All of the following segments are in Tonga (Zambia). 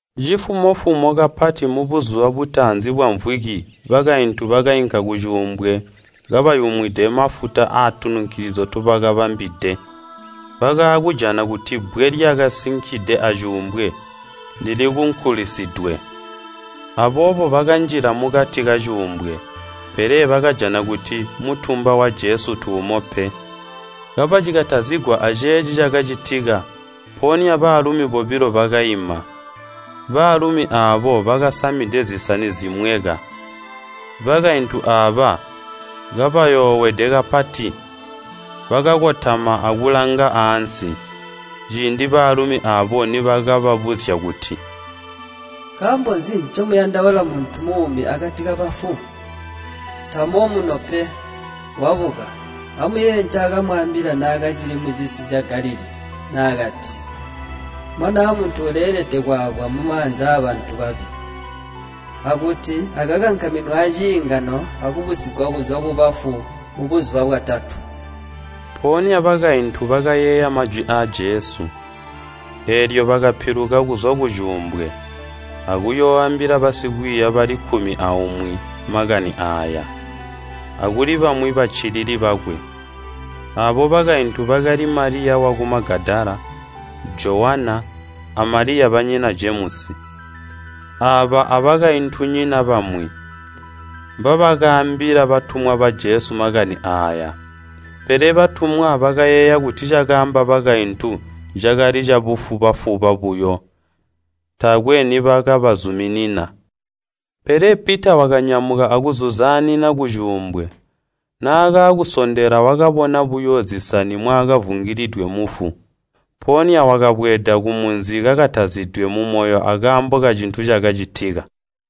Cifumo-fumo kapati mubuzuba butaanzi bwamvwiki bakaintu bakainka kucuumbwe kabayumwide mafuta atununkilizyo ntobakabambidwe. Bakaakujana kuti bbwe lyakasinkide acuumbwe lili kunkulisidwe. Aboobo bakanjila mukati kacuumbwe, pele bakajana kuti mutumba wa Jesu tuumo pe. Kabacikatazigwa aceeci cakacitika, mpoonya baalumi bobilo bakaima. Baalumi aabo bakasamide zisani zimweka. Bakaintu aaba, kabayoowede kapati, bakakotama akulanga ansi, ciindi baalumi aabo niibakababuzya kuti, “Nkaambo nzi ncomuyandaula muntu muumi akati kabafu? Tamo muno pe, wabuka! Amuyeeye ncaakamwaambila naakacili mucisi ca Galilii naakati, ‘Mwanaa Muntu uleelede kwaabwa mumaanza aabantu babi, akuti akankaminwe aciingano akubusigwa kuzwa kubafu mubuzuba bwatatu?’” Mpoonya bakaintu bakayeeya majwi aa Jesu, eelyo bakapiluka kuzwa kucuumbwe, akuyooambila basikwiiya bali kkumi aumwi makani aaya, akuli bamwi baccilili bakwe. Aabo bakaintu bakali Maliya waku Magadala, Jowana, a Maliya banyina Jemusi. Aaba abakaintunyina bamwi, mbabakaambila batumwa ba Jesu makani aaya. Pele batumwa bakayeeya kuti cakaamba bakaintu cakali cabufuba-fuba buyo, taakwe nibakabazuminina. Pele Pita wakanyamuka akuzuzaanina kucuumbwe. Naakaakusondela wakabona buyo zisani mwakavungailidwe mufu. Mpoonya wakabweeda kumunzi kakatazidwe mumoyo akaambo kacintu cakacitika.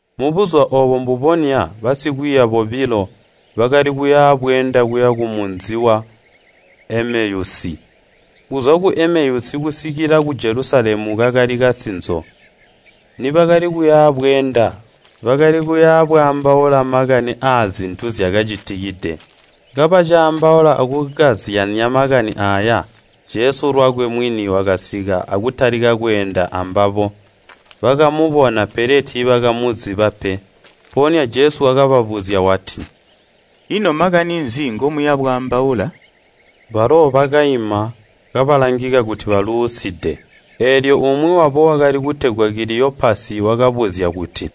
Mubuzuba oobo mbubonya basikwiiya bobilo, bakali kuya bweenda kuya kumunzi wa Emeyusi. Kuzwa ku Emeyusi kusikila ku Jelusalemu kakali kasinzo, nibakali kuya bweenda bakali kuya bwaambaula makani aazintu zyakacitikide. Kabacaambaula akukazyanya makani aaya, Jesu lwakwe mwini wakasika akutalika kweenda ambabo. Bakamubona, pele tiibakamuziba pe. Mpoonya Jesu wakababuzya wati, “Ino makani nzi ngomuya bwaambaula?” Balo bakaima, kabalangika kuti baluuside. Eelyo umwi wabo wakali kutegwa Kiliyopasi wakabuzya kuti,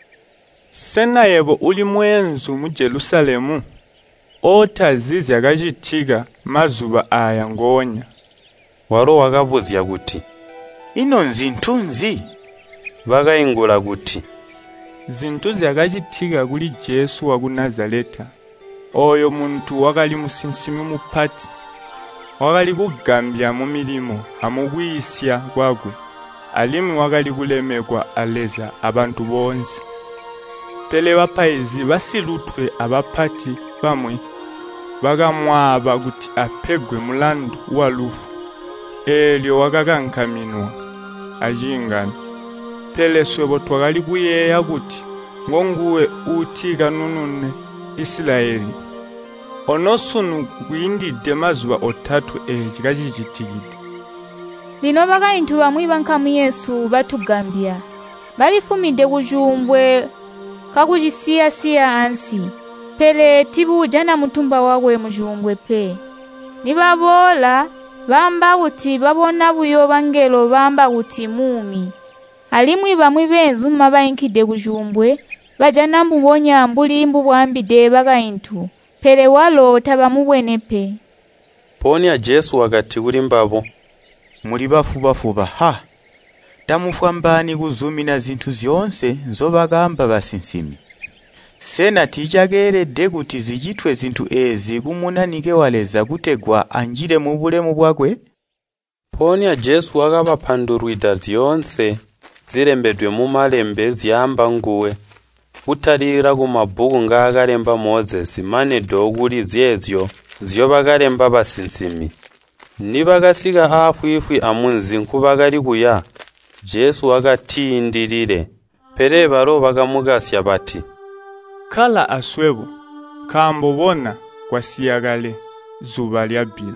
“Sena yebo uli mweenzu mu Jelusalemu, ootazi zyakacitika mazuba aaya ngoonya?” Walo wakabuzya kuti, “Ino nzintu nzi?” Bakaingula kuti, “Zintu zyakacitika kuli Jesu waku Nazaleta. Ooyu muntu wakali musinsimi mupati, wakali kugambya mumilimo amukwiisya kwakwe, alimwi wakali kulemekwa a Leza abantu boonse. Pele bapaizi basilutwe abapati bamwi bakamwaaba kuti apegwe mulandu walufu, eelyo wakankaminwa aciingano. Pele swebo twakali kuyeeya kuti ngonguwe uuti kanunune Isilayeli! Ono sunu kwiindide mazuba otatwe eeci kacicitikide. Lino bakaintu bamwi bankamu yesu batugambya. Balifumide kucuumbwe kakucisiya-siya ansi pele tiibuujana mutumba wakwe mucuumbwe pe. Nibaboola baamba kuti babona buyo bangelo baamba kuti muumi. Alimwi bamwi beenzuma bainkide kucuumbwe, bajana mbubonya mbuli bwaambide bakaintu pele walo tabamubwene pe.” Mpoonya Jesu wakati kulimbabo, “Muli bafuba-fuba, ha! Tamufwambaani kuzumina zintu zyoonse nzobakaamba basinsimi! Sena tiicakeelede kuti zicitwe zintu eezi ku Munanike wa Leza kutegwa anjile mubulemu bwakwe?” Mpoonya Jesu wakabapandulwida zyoonse zilembedwe mu Malembe zyaamba nguwe, kutalikila kumabbuku ngaakalemba Mozesi mane do kuli zeezyo nzyobakalemba basinsimi. Nibakasika aafwiifwi amunzi nkubakali kuya, Jesu wakatiindilile, pele balo bakamukasya bati, “Kkala aswebo, nkaambo bona, kwasiya kale, zuba lyabbila.”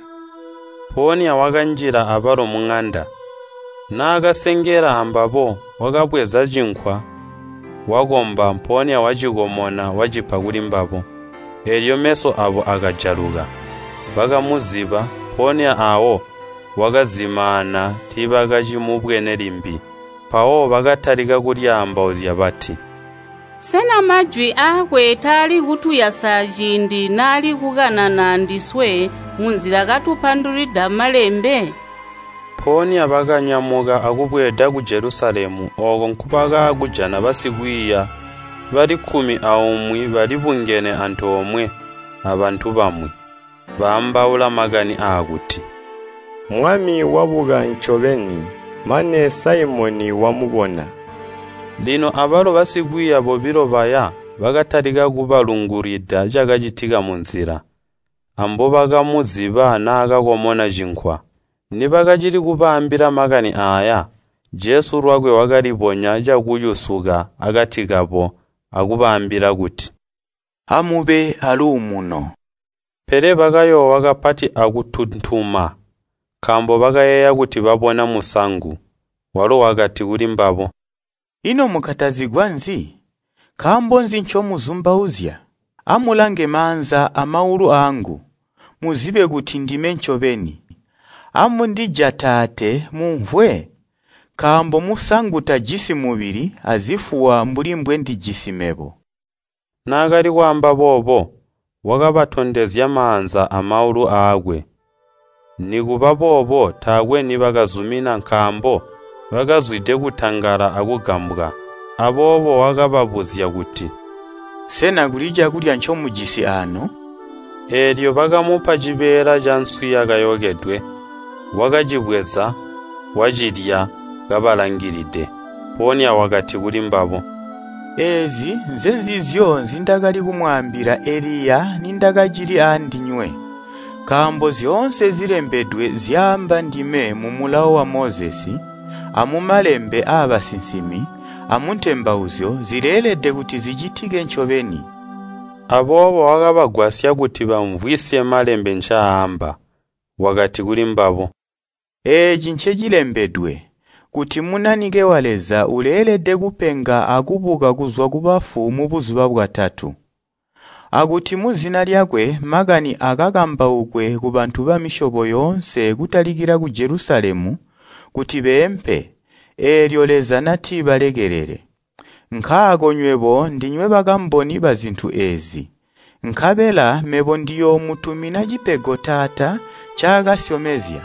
Mpoonya wakanjila abalo muŋanda. Naakasengela ambabo, wakabweza cinkwa, wakomba, mpoonya wacikomona wacipa kulimbabo. Eelyo meso aabo akajaluka, bakamuziba, mpoonya aawo wakazimaana tiibakacimubwene limbi. Mpawo bakatalika kulyaambauzya bati, “Sena majwi aakwe taali kutuyasa ciindi naali kukanana andiswe munzila katupandulwida Malembe?” Mpoonya bakanyamuka akubweeda ku Jelusalemu ooko nkubakaakujana basikwiiya bali kkumi aumwi balibungene antoomwe abantu bamwi, baambaula makani aakuti, “Mwami wabuka ncobeni! Mane Saimoni wamubona!” Lino abalo basikwiiya bobilo baya bakatalika kubalungulwida cakacitika munzila, ambobakamuziba naakakomona cinkwa. Nibakacili kubaambila makani aaya, Jesu lwakwe wakalibonya cakuyusuka akati kabo akubaambila kuti, “Amube aaluumuno.” Pele bakayoowa kapati akuntuntuma, nkaambo bakayeeya kuti babona musangu. Walo wakati kulimbabo, “Ino mukatazigwa nzi? Nkaambo nzi ncomuzumbauzya? Amulange maanza amaulu aangu, muzibe kuti ndime ncobeni. Amundijataate mumvwe, nkaambo musangu tajisi mubili, azifuwa mbuli mbwendijisi mebo.” Naakali kwaamba boobo, wakabatondezya maanza amaulu aakwe. Nikubaboobo taakwe nibakazumina nkaambo bakazwide kutangala akugambwa, aboobo wakababuzya kuti, “Sena kuli cakulya ncomujisi aano?” Eelyo bakamupa cibeela canswi yakayokedwe. Wakacibweza, wacilya kabalangilide. Mpoonya wakati kulimbabo, “Eezi nzenzizyo nzindakali kumwaambila eliya nindakacili aandinywe, nkaambo zyoonse zilembedwe zyaamba ndime mu Mulawo wa Mozesi, amumalembe aabasinsimi, amu Ntembauzyo, zileelede kuti zicitike ncobeni.” Aboobo wakabagwasya kuti baamvwisye Malembe ncaamba. Wakati kulimbabo, “Eeci ncecilembedwe, kuti Munanike wa Leza uleelede kupenga akubuka kuzwa kubafu mubuzuba bwatatu, akuti muzina lyakwe makani aakambaukwe kubantu bamisyobo yoonse kutalikila ku Jelusalemu, kuti beempe, eelyo Leza nati balekelele. Nkaako nywebo ndinywe bakamboni bazintu eezi. Nkabela mebo ndiyoomutumina cipego Taata ncaakasyomezya,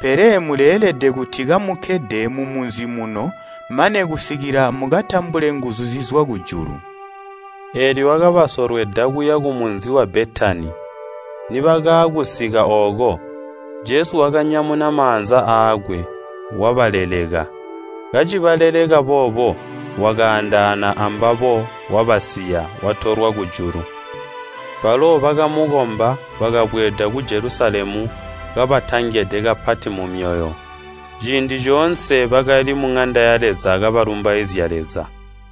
pele muleelede kuti kamukkede mumunzi muno mane kusikila mukatambule nguzu zizwa kujulu.” Eelyo wakabasolweda kuya kumunzi wa Betani, nibakaakusika ooko, Jesu wakanyamuna maanza aakwe, wabaleleka. Kacibaleleka boobo, wakaandaana ambabo wabasiya, watolwa kujulu. Balo bakamukomba, bakabweeda ku Jelusalemu kabatangede kapati mumyoyo. Ciindi coonse bakali muŋanda ya Leza kabalumbaizya Leza.